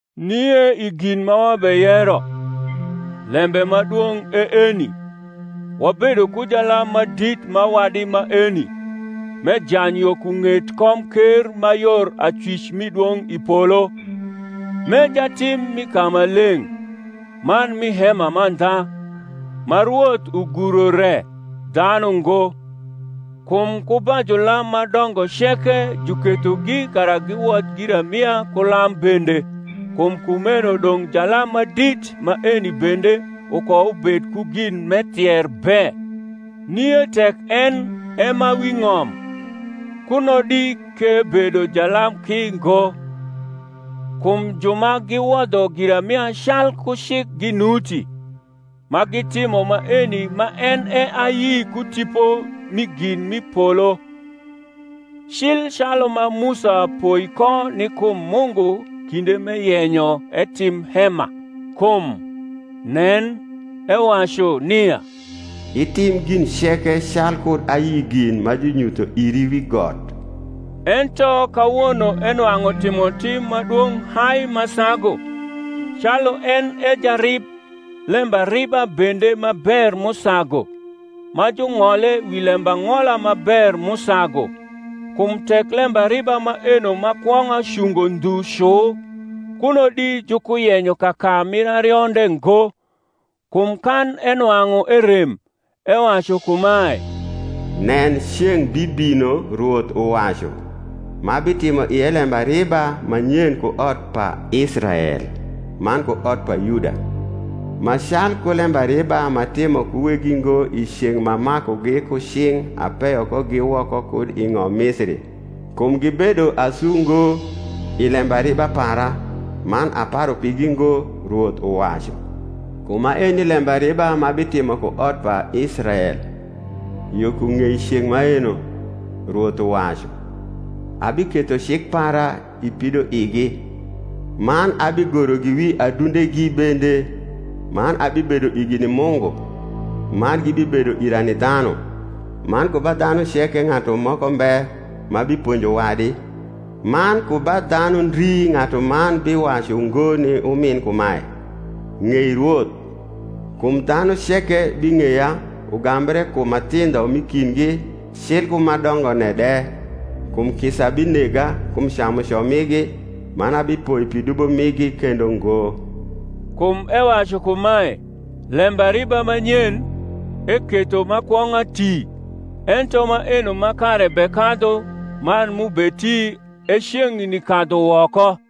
Nie i gin ma wabeyero, lembe ma dwong’ e eni; Wabedo ku jalam ma dit ma wadi maeni, m’ejany yo ku ng’et komker ma yor acwic mi dwong’ i polo, m’e jatim mi kamaleng’, man mi hema mandha, ma Rwoth uguro re, dhanu ngo. Kum ku ba julam ma dongo ceke jukethogi kara giwodh giramia ku lam bende: kum kumeno dong’ jalam ma dit maeni bende ukoubed ku gin m’ethier be. Nie tek en e ma wi ng’om, kuno di k’ebedo jalam ki ngo, kum ju ma giwodho giramia calku cik ginuti; ma gitimo maeni ma en e ayi ku tipo mi gin m’i polo, cil calu ma Musa poi ko ni kum Mungu kinde m’eyenyo etim hema: kum, Nen, ewacu, nia itim gin ceke calkud ayi gin ma junyutho iri wi got. Ento kawono enwang’u timotim ma dwong’ hai ma sagu, calu en e jarib lembariba bende ma ber m’usagu, ma jung’ole wi lembang’ola ma ber m’usagu. Kum tek lembariba maeno ma kwong’a cungo ndhu cu, kuno di jukuyenyo kaka mir arionde ngo. Kum kan enwang’u erem, ewacu kumae, Nen, ceng’ bibino, Rwoth uwacu, M’abitimo ie lembariba ma nyen ku ot pa Israel man ku ot pa Yuda; Ma calku lembariba m’atimo ku weggi ngo I ceng’ m’amakugi ku cing’ apeyo kogi woko kud i ng’om Misiri; Kum gibedo asu ngo i lembariba para, Man aparu pigi ngo, Rwoth uwacu. Kum maeni lembariba m’abitimo ku ot pa Israel Yo ku ng’ei ceng’ maeno, Rwoth uwacu; Abiketho cik para i pidoigi, Man abigorogi wi adundegi bende: Man abibedo igi ni Mungu, Man gibibedo ira ni dhanu: Man ku ba dhanu ceke ng’atu moko mbe ma biponjo wadi, Man ku ba dhanu ndri ng’atuman bi wacu ngo ni umin kumae, Ng’ei Rwoth: Kum dhanu ceke bing’eya, Ugambre kum ma thindho m’i kindgi cil ku ma dongone de. Kum kisa binega kum camuco migi, Man abipoi pi dubo migi kendo ngo. Kum ewacu kumae, Lembariba ma nyen, eketho ma kwong’a ti. Ento maeno ma kare bekadhu man m’ubeti e ceng’ni kadhu woko.